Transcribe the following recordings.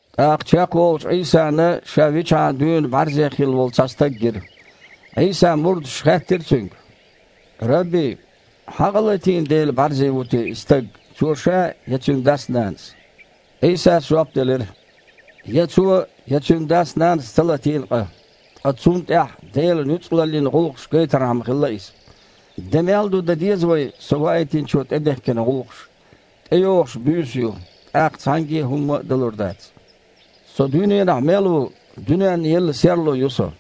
ТІаккха чекхволучу Іийсана ша вичхьана дуьйна бІаьрзе хилла волу цхьа стаг гира. Іийсан мурдаша хаьттира Цуьнга: « Рабби! Хьан къа латийна дела бІаьрзе ву те и стаг, цо ша я цуьнан дас-нанас?» Іийсас жоп делира: «Я цо, я цуьнан дас-нанас ца латийна къа, ткъа цунна тІехь Делан нуьцкъалаллин гІуллакхаш гайтархьама хилла иза. Де мел ду дан деза вай Со Ваийтинчо тІедехкина гІуллакхаш. ТІейогІуш буьйса ю, тІаккха цхьаьнгге а хІумма а далур дац. Со дуьненахь мел ву, дуьненна елла серло ю Со».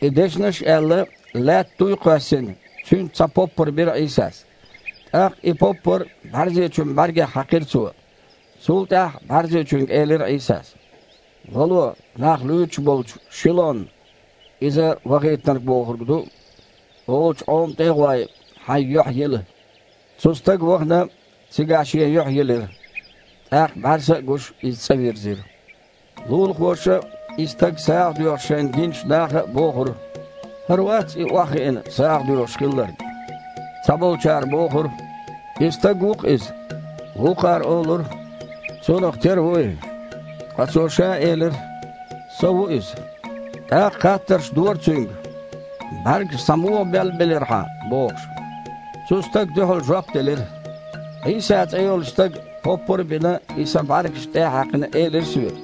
И дешнаш аьлла, лаьтта туй а кхоьссина, цуьнца цхьа поппар бира Іийсас. ТІаккха и поппар бІаьрзечун бІаьргех хьаькхира Цо. Цул тІаьхьа бІаьрзечуьнга элира Іийсас: «Вало, нах луьйчуш болчу Шилон (иза „вахийтинарг“ бохург ду) олучу Іома тІе а гІой, хьайн юьхь йила». Цу стага, вахана, цигахь шен юьхь йилира, тІаккха бІаьрса а гуш, иза цІа вирзира. Лулахоша а, и стаг сагІа доьхуш шайна гиначу наха а бохура: «ХІара вац и, охьахиъна, сагІа доьхуш хилларг?» Цхьаболчара бохура: «И стаг ву-кх иза». Вукхара олура: «Цунах тера ву и». Ткъа цо ша элира: «Со ву иза». ТІаккха хаттарш дора цуьнга: «БІаьргаш схьа муха беллабелира хьан?» – бохуш. Цу стага дуьхьал жоп делира: «Іийса цІе йолчу Стага, поппар а бина, и сан бІаьргашна тІе а хьаькхна, элира соьга: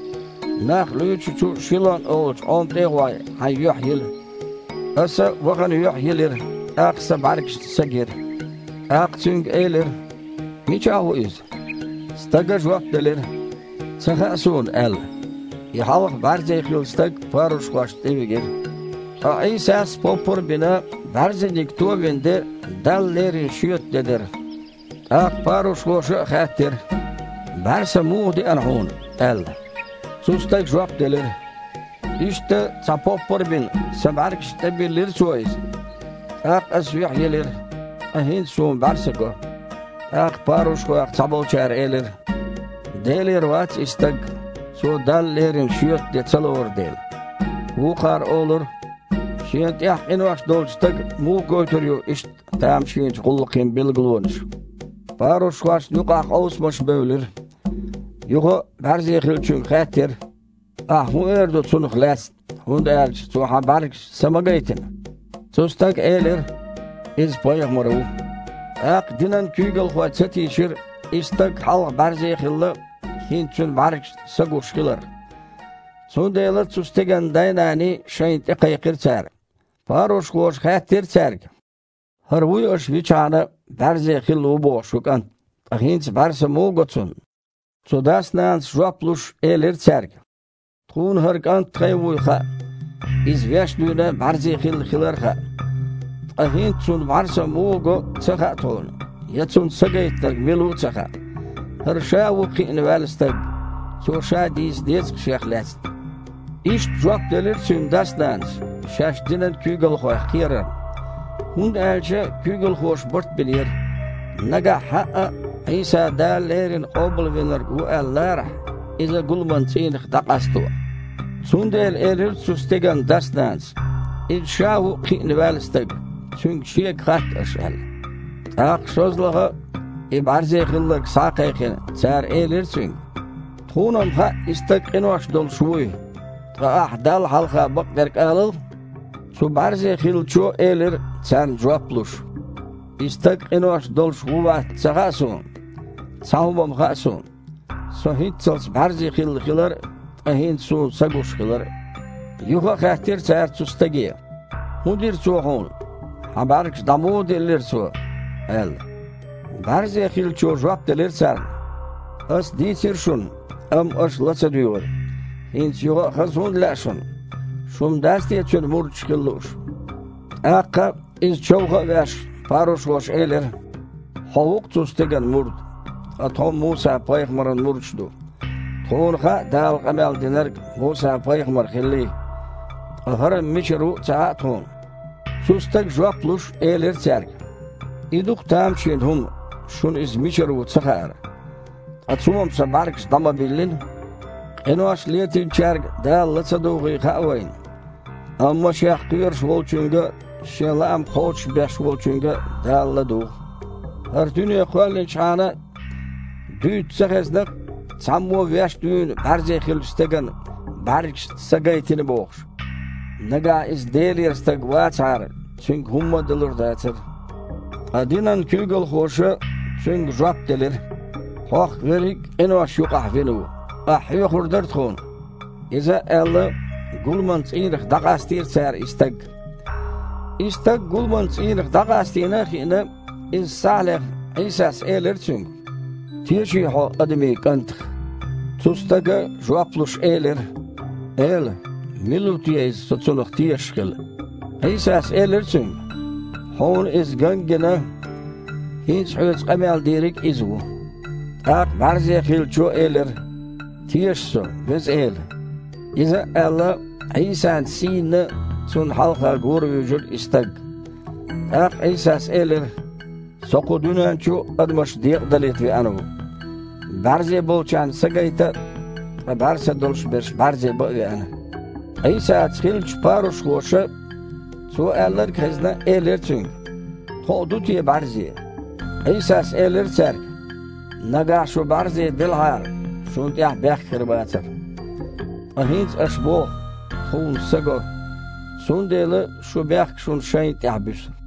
„Нах луьйчучу Шилон олучу Іома тІе а гІой, хьайн юьхь йила“. Аса, вахана, юьхь йилира, тІаккха сан бІаьргашна са гира». ТІаккха цуьнга элира: «Мичахь ву Иза?» Стага жоп делира: «Ца хаьа суна», – аьлла. И хьалха бІаьрзе хилла стаг парушхошна тІевигира. Ткъа Іийсас, поппар а бина, бІаьрзениг товина де Далла лерина шоьтан де дара. ТІаккха парушхоша а хаьттира: «БІаьрса муха деана хьуна?» – аьлла. Цу стага жоп делира: «Иштта, цхьа поппар а бина, сан бІаьргашна тІебиллира Цо иза. ТІаккха ас юьхь йилира, ткъа хІинца суна бІаьрса го». ТІаккха парушхойх цхьаболчара элира: «Делера вац и Стаг, Цо Далла лерина шоьтан де ца лору дела». Вукхара олура: «Шена тІехь къинош долчу стага муха гойтур ю иштта тамашийначу гІуллакхийн билгалонаш?» Парушхошна юкъахь къовсамаш бевлира. Юха а бІаьрзе хиллачуьнга хаьттира: «Ахь хІун эр ду Цунах лаьцна, хІунда аьлча Цо хьан бІаьргашна са ма гайтина?» Цу стага элира: «Иза пайхамар ву». ТІаккха динан куьйгалхой ца тийшира и стаг, хьалха бІаьрзе а хилла, хІинца цуьнан бІаьргашна са гуш хиларх. Цундела цу стеган дай-наний шайна тІекхайкхира цара. Парушхоша хаьттира цаьрга: «ХІара вуй аша вичхьана а бІаьрзе хилла ву боху шун кІант? Ткъа хІинца бІаьрса муха го цунна?» Цу дас-нанас, жоп луш, элира цаьрга: «Тхуна хІара кІант тхайн вуй хаьа, иза веш дуьйна а бІаьрзе хилла хилар а хаьа. Ткъа хІинца цунна бІаьрса муха го а ца хаьа тхуна, я цунна са Гайтинарг мила ву а ца хаьа. ХІара ша а ву кхиъна ваьлла стаг, цо ша дийца деза-кх шех лаьцна». Иштта жоп делира цуьнан дас-нанас, шаьш динан куьйгалхойх кхерарна. ХІунда аьлча куьйгалхоша барт бинера, нагахь хьаъа а Іийса Дала леррина Къобалвинарг ву аьлла ларахь, иза гуламан цІийнах дІакъасто. Цундела элира цу стеган дас-нанас: «Иза ша а ву кхиъна ваьлла стаг, цуьнга шега хатта аша», – аьлла. ТІаккха, шозлагІа а и бІаьрзе хилларг схьа а кхайкхина, цара элира цуьнга: «Тхуна-м хаьа и Стаг къинош долуш вуй. Ткъа ахьа Далла хьалха бакъдерг алал». Цу бІаьрзе хиллачо элира, царна жоп луш: «И Стаг къинош долуш ву я вац-м ца хаьа суна. Цхьа хІума-м хаьа суна: Со хІинццалц бІаьрзе хилла хилар а, ткъа хІинца суна са гуш хилар а». Юха а хаьттира цара цу стаге: «ХІун дира Цо хьуна? Хьан бІаьргаш дІа муха диллира Цо?» – аьлла. БІаьрзе хиллачо жоп делира царна: «Ас дийцира шуна, амма аша ла ца дуьйгІира. ХІинца юха а хаза хІунда лаьа шуна? Шу-м дац те Цуьнан мурдаш хила лууш?» ТІаккха, иза човха а веш, парушхоша элира: «Хьо ву-кх цу Стеган мурд, ткъа тхо-м Муса-пайхамаран мурдаш ду. Тхуна хаьа Дала къамел динарг Муса-пайхамар хиллий, ткъа ХІара-м мичара ву а ца хаьа тхуна». Цу стага, жоп луш, элира цаьрга: «И ду-кх тамашийна хІума, шуна Иза мичара ву цахаар. Ткъа Цо-м сан бІаьргаш дІа ма биллина. Къинош летийначаьрга Дала ла ца дугІий хаьа вайна. Амма Шех кхоьруш волчуьнга а, Шен лаам кхочушбеш волчуьнга а Дала ладугІу. ХІара дуьне кхоьллинчхьана а дуьйцу ца хезна-кх, цхьаммо а веш дуьйна бІаьрзе хиллачу стеган бІаьргашна са гайтийтина бохуш. Нагахь Иза Делера Стаг вацахьара, Цуьнга хІумма а далур а дацара». Ткъа динан куьйгалхоша цуьнга жоп делира: «Хьо-х верриг а къинош юкъахь вина ву. Ахь хьоьхур дара тхуна?» Иза а аьлла, гуламан цІийнах дІакъастийра цара и стаг. И стаг гуламан цІийнах дІакъастийнийла а хиъна, иза схьа а лехна, Іийсас элира цуьнга: «Теший хьо Адамийн КІантах?» Цу стага, жоп луш, элира: «Эла, Мила ву те Иза, со Цунах тешаш хила?» Іийсас элира цуьнга: «Хьуна Иза ган а гина, хІинца хьоьца къамел Дийриг а Иза ву». ТІаккха бІаьрзе хиллачо элира: «Теша со, Веза Эла!» Иза а аьлла, Іийсан сийнна Цунна хьалха гора вуьйжира и стаг. ТІаккха Іийсас элира: «Со кху дуьнен чу адамаш декъадалийта веана ву. БІаьрзе болчарна са гайта а, ткъа бІаьрса долуш берш бІаьрзе бан а веана». Іийсаца хиллачу парушхоша, Цо аьлларг а хезна, элира Цуьнга: «Тхо а ду те бІаьрзе?» Іийсас элира цаьрга: «Нагахь шу бІаьрзе делахьара, шуна тІехь бехк хир бацара. Ткъа хІинца аш боху: „Тхуна са го“, – цундела шун бехк шуна шайна тІехь буьсу».